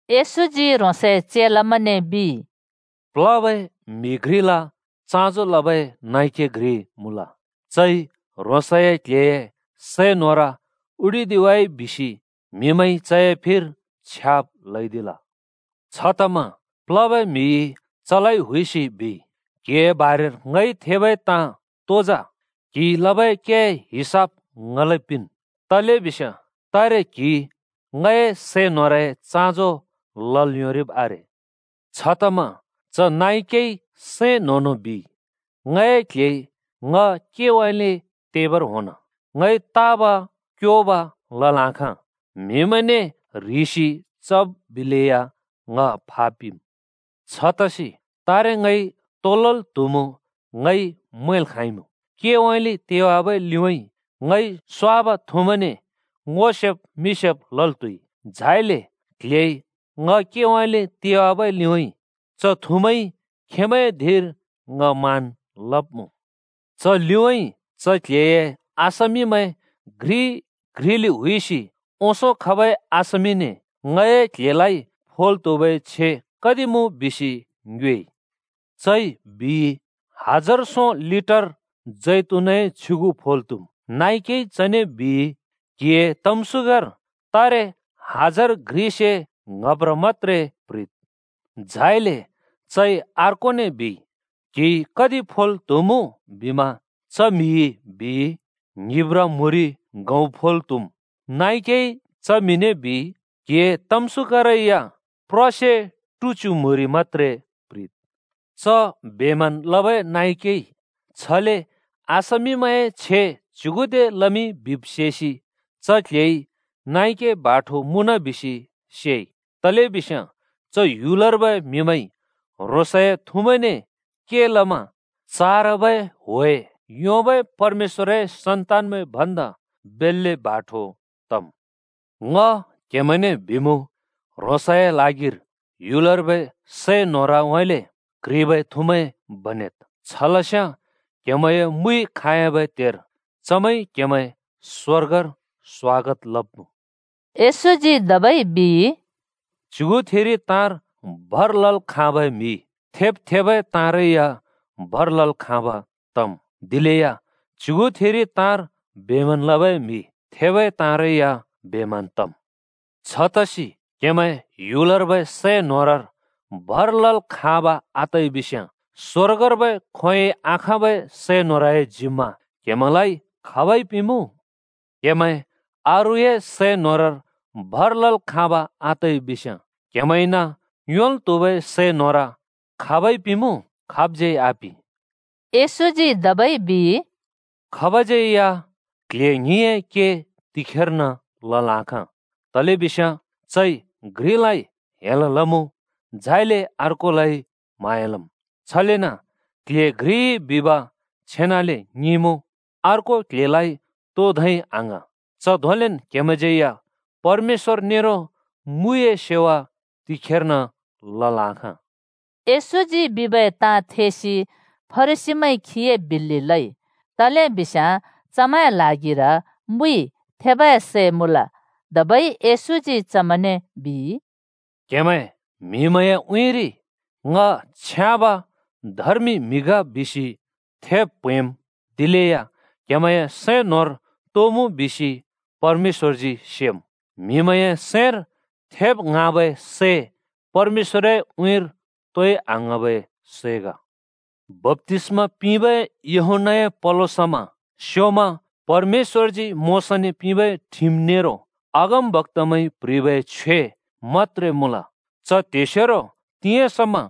येशूजी ह्रोंसए चेलामैंने बिइ, “प्लबै म्‍हि घ्रिल चाँजो लबै नाइके म्हि घ्रि मुँल। चइ ह्रोंसए क्ल्हेए सम्पति उडिदिवाइ बिसि म्हिमैंइ चए फिर छ्याब् ल्हैदिल। “छतमा प्लबै म्हिइ चलाइ हुइसि बिइ, ‘क्‍हिए बारेर ङइ थेबै ताँ तो जा? क्‍हिइ लबै केए हिसाब ङलाइ पिंन्। तलेबिस्याँ तारे क्‍हि ङए सै न्होरए चाँजो लल् योंरिब् आरे।’ “छतमा च नाइकेइ सैं न्‍हों-न्‍हों बिइ, ‘ङए क्‍ल्‍हेइ ङ केउँइँले तेबर होंना। ङइ ताब क्योब लल् आखाँ, म्हिमैंने ह्रिसि चब् बिलेया ङ फापिम्‌। छतसि तारे ङइ तो लल् त्हुमुँ ङइ मैंल् खाँइमुँ। केउँइँले तेवाबै लिउँइँ ङइ स्वाब थुमैंने ङो सेब् मिं सेब् लल् त्‍हुइ। झाइले क्‍ल्‍हेइ ङ केउँइँले तेवाबै लिउँइँ च थुमैंइ खेंमैंए धिंर ङ मान लब्‍मुँ।’ “च लिउँइँ चइ क्‍ल्‍हेए असामिमैं घ्रि घ्रिले हुइसि ओंसों खबै असामिने ‘ङए क्‍ल्‍हेलाइ फोल् त्हुबै छे कति मुँ?’ बिसि ङ्योएइ। “चइ बिइ, ‘हजार सों लिटर जैतून‍ए छ्युगु फोल् त्‍हुम्।’ “नाइकेइ चने बिइ, ‘क्‍हिए तमसुकर तारे हजार घ्रिसे ङ्‍हब्र मत्‍त्रे प्‍ह्रिद्।’ “झाइले चइ अर्कोने बिइ, ‘क्‍हिइ कति फोल त्‍हुमुँ बिमा।’ “च म्हिइ बिइ, ‘ङ्हिब्र म्हुरि गहुँ फोल् त्हुम्।’ “नाइकेइ च म्हिने बिइ, ‘क्‍हिए तमसूकरै या प्ह्रसे टुच्यु म्हुरि मत्‍त्रे प्‍ह्रिद्।’ “च बेमान लबै नाइकेइ छले असामिमैंए छे च्युगुदे लमिंइ बिब् सेसि च क्‍ल्‍हेइ नाइके बाठो मुँन बिसि सेइ। तलेबिस्याँ चु ह्‍युलर्बै म्‍हिमैंइ ह्रोंसए थुमैंने के लमा चारबै ह्‍वे योंबै परमेश्‍वरए सन्तानमैं भन्दा बेल्‍ले बाठो तम्। “ङ क्हेमैंने बिमुँ, ह्रोंसए ल्हागिर ह्‍युलर्बै स न्होरउँइँले क्ह्रिबै थुमैं बनेद्। छ लस्‍याँ क्‍हेमैंए मुइ खाँयाबै त्‍हेर चमैंइ क्‍हेमैं स्‍वर्गर स्वागत लब्मुँ।” येशूजी धबै बिइ, “च्‍युगुथिरि ताँर भर लल् खाँबै म्हि थेब् थेबै ताँरै या भर लल् खाँब तम्। दिलेया च्‍युगुथिरि ताँर बेमान लबै म्हि थेबै ताँरै या बेमान तम्। छतसि क्हेमैं ह्‍युलर्बै सै न्होरर भर लल् खाँब आतइ बिस्‍याँ, स्‍वर्गर्बै खोंयोंइ आखाँबै सै न्होरए जिम्मा क्‍हेमैंलाइ खाबइ पिंमुँ? क्हेमैं अरूए सै न्होरर भर लल् खाँब आतइ बिस्‍याँ, क्‍हेमैंइन योंल् त्हुबै सै न्होर खाबइ पिंमुँ? खाबज्यै आपिं।” येशूजी धबै बिइ, “खाबज्यै या क्‍ल्‍हे ङ्हिंए के तिखेर्न लल् आखाँ। तलेबिस्याँ चइ घ्रिलाइ हेल लमुँ, झाइले अर्कोने म्‍हाँया लमुँ। छलेन क्‍ल्‍हे घ्रिइ बिब छेनाले ङिमुँ, अर्को क्ल्हेलाइ तो धोंइ आङ्हाँ। च धोंलेन् क्‍हेमैंज्यै या परमेश्‍वर नेरो मुइए सेवा तिखेर्न लल् आखाँ।” येशूजी बिबै ताँ थेसि फरिसीमैंइ खीए बिल्‍लि लइ। तलेबिस्याँ चमैंए ल्हागिर मुइ थेबै सै मुँल। धबै येशूजी चमैंने बिइ, “क्‍हेमैं म्‍हिमैंए उँइँरि ‘ङ छ्याँब धर्मि म्‍हि ग’ बिसि थेब प्‍हैंम्। दिलेया क्हेमैंए सैं न्होंर तो मुँ बिसि परमेश्‍वरजी सेम्। म्‍हिमैंए सैंर थेब ङ्हाँबै सै परमेश्‍वरए उँइँर तोइ आङिंबै सै ग। “बप्‍तिस्मा पिंबै यूहन्‍नाए पलो समा स्‍योंमा परमेश्‍वरजी मोशाने पिंबै ठिम नेरो अगमबक्‍तामैंइ प्‍ह्रिबै छ्वे मत्‍त्रे मुँल। च त्हेसेरो तिंयाँ समा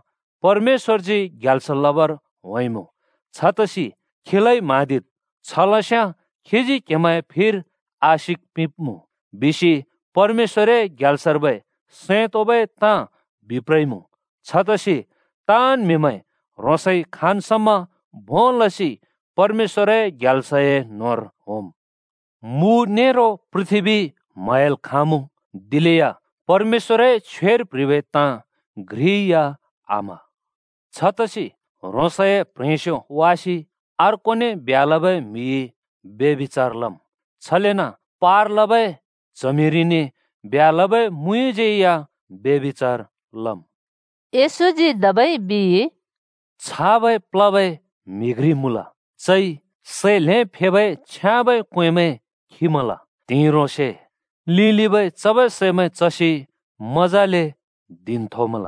‘परमेश्‍वरजी ग्याल्स लबर होंइमुँ। छतसि खीलाइ म्‍हाँदिद्, छ लस्याँ खीजी क्‍हेमैंए फिर आशिक पिंब्‍मुँ,’ बिसि परमेश्‍वरए ग्याल्सर्बै सैं तोंबै ताँ बिप्रइमुँ। छतसि ताँन् म्‍हिमैं ह्रोंसइ खाँन् समा भों लसि परमेश्‍वरए ग्याल्सए न्होंर होंम्। दिलेया मु नेरो पृथ्‍बी म्‍हयाल् खाँमुँ, परमेश्‍वरए छ्वेर प्ह्रिबै ताँ घ्रि या आम्ह। “छतसि ह्रोंसए प्ह्रेंस्यो वासि अर्कोने ब्ह्‍या लबै म्हिइ ब्यभिचार लम्। छलेन पार लबै च्हमिरिने ब्ह्‍या लबै मुँयुँज्यैया ब्यभिचार लम्।” येशूजी धबै बिइ, “छाबै प्लबै म्‍हि घ्रि मुँल। चइ सै ल्हें फेबै छ्याँबै क्‍वेंमैं खिमल। त्हिंइ ह्रोंसे लिं-लिंबै चबै सैमैं चसि मजाले त्हिंइ थोमल।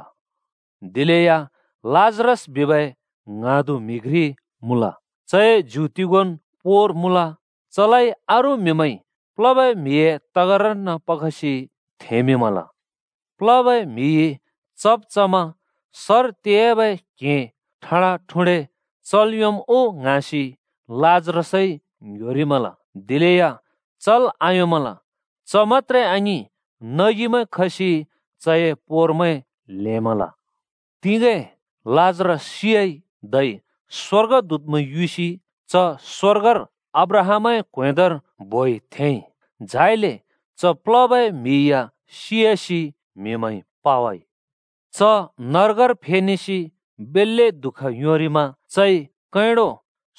दिलेया लाजरस बिबै ङ्हाँदु म्हि घ्रि मुँल। च‍ए ज्यु तिगोंन् पोर मुँल। चलाइ अरू म्हिमैंइ प्लबै म्‍हिए तगारर्न पखसि थेंमिंमल। ‘प्‍ल्हो‍बै म्‍हिइ चब् चमा सर तेयाबै क्हें ठाँडा-ठुँडे चल् योंम् उ?’ ङ्हाँसि लाजरस ङाँइ ङ्‌ह्‍योरिमल। दिलेया चल् आयोंमल, च मत्‍त्रे आङिं, नगिमैं खसि चए पोरमैं ल्‍हेंमल। “तिगें लाजरस सियाइ। धै स्‍वर्गदूतमैं युसि च स्‍वर्गर अब्राहामए क्वेंदर बोइ थेंइ। झाइले च प्‍ल्हो‍बै म्हि या सियासि म्हिमैंइ पावाइ। च नर्गर फेनेसि बेल्‍ले दुःख योंरिमा चइ कैंडु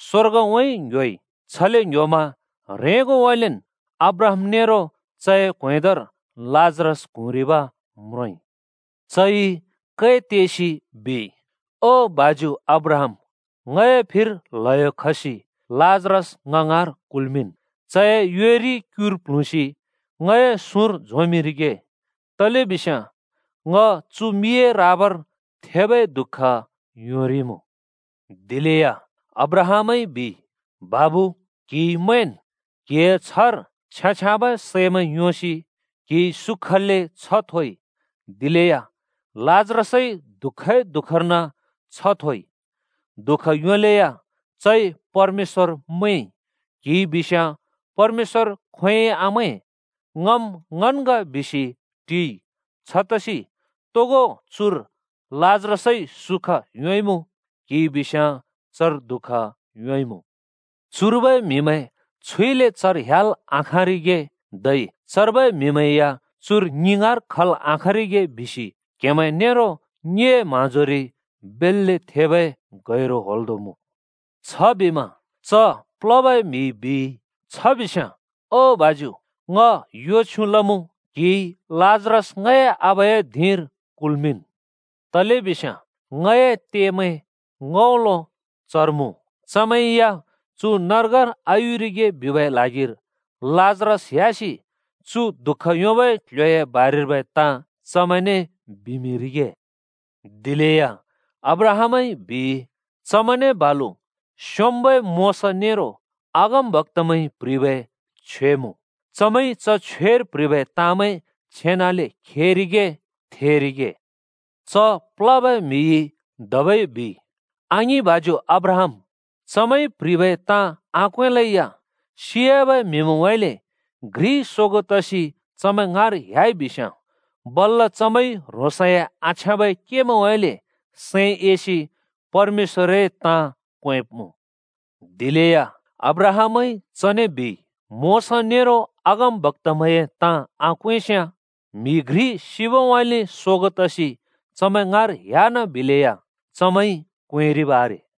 स्‍वर्गउँइँ ङ्‌ह्‍योइ छले ङ्ह्‍योमा ह्रेंगोउँइँलेन् अब्राहाम नेरो चए क्वेंदर लाजरस क्हुँरिब् म्रोंइ। “चइ कै तेसि बिइ, ‘ओ बाज्‍यू अब्राहाम, ङए फिर ल्हयो खसि लाजरस ङ ङाँर कुल्मिंन्। चए योरि क्‍युर प्‍ल्हुँसि ङए सुँर झोंमिंरिगे। तलेबिस्या ङ चु मिए राबर थेबै दुःख योंरिइमुँ।’ “दिलेया अब्राहामइ बिइ, ‘बाबु, क्‍हिइ मैंन्। क्‍हिए छ्हर छ्याँ-छ्याँबै सैमैं योंसि क्हिइ सुखले छ्ह थोइ। दिलेया लाजरसइ दुःखै दुःखर्न छ्ह थोइ। दुःख योंलेया चइ परमेश्‍वर मैंइ, क्हिइ बिस्याँ परमेश्‍वर खोंयोंइ आमैं, ङम् ङन् ग बिसि टिइ। छतसि तोगो लाजरसइ चुर सुख योंइमुँ, क्‍हिइ बिस्याँ चर दुःख योंइमुँ। चुर्बै म्‍हिमैं छुइले चर ह्‍याल् आखाँरिगे, धै चर्बै म्हिमैं या चुर ङि ङाँर खल् आखाँरिगे बिसि क्‍हेमैं नेरो ङिए म्‍हाँजोरि बेल्‍ले थेबै गैरु होंल्दों मुँ।’ “छबिमा च प्‍ल्हो‍बै म्‍हिइ बिइ, ‘छ बिस्‍याँ, ओ बाज्‍यू, ङ यो छ्युँ लमुँ क्‍हिइ लाजरस ङए आबाए धिंर कुल्‍मिंन्। तलेबिस्याँ ङए त्येमैं ङ्‍हउलो चर मुँ। चमैं या चु नर्गर आयुरिगे बिबै ल्हागिर लाजरस ह्‍यासि चु दुःख योंबै क्‍ल्ह्‍योए बारेर्बै ताँ चमैंने बिमिंरिगे।’ “दिलेया अब्राहामइ बिइ, ‘चमैंने बालु स्‍योंम्‍बै मोशा नेरो अगमबक्‍तामैंइ प्‍ह्रिबै छ्वे मुँ। चमैंइ च छ्वेर प्ह्रिबै ताँमै छेनाले खेरिगे, थेरिगे।’ “च प्‍ल्हो‍बै म्‍हिइ धबै बिइ, ‘आङिं, बाज्‍यू अब्राहाम, चमैंइ प्ह्रिबै ताँ आक्वेंलै या सियाबै म्‍हिमैंउँइँले घ्रि सोगों तसि चमैं ङाँर ह्‍याइ बिस्‍याँ बल्‍ल चमैंइ ह्रोंसए आछ्याँबै केमैंउँइँले सैं एसि परमेश्‍वरए ताँ क्वेंब्मुँ।’ “दिलेया अब्राहामइ चने बिइ, ‘मोशा नेरो अगमबक्‍तामैंए ताँ आक्वेंस्याँ म्‍हि घ्रि सिबउँइँले सोगों तसि चमैं ङाँर ह्‍याना बिलेया चमैंइ क्‍वेंरिब् आरे।’”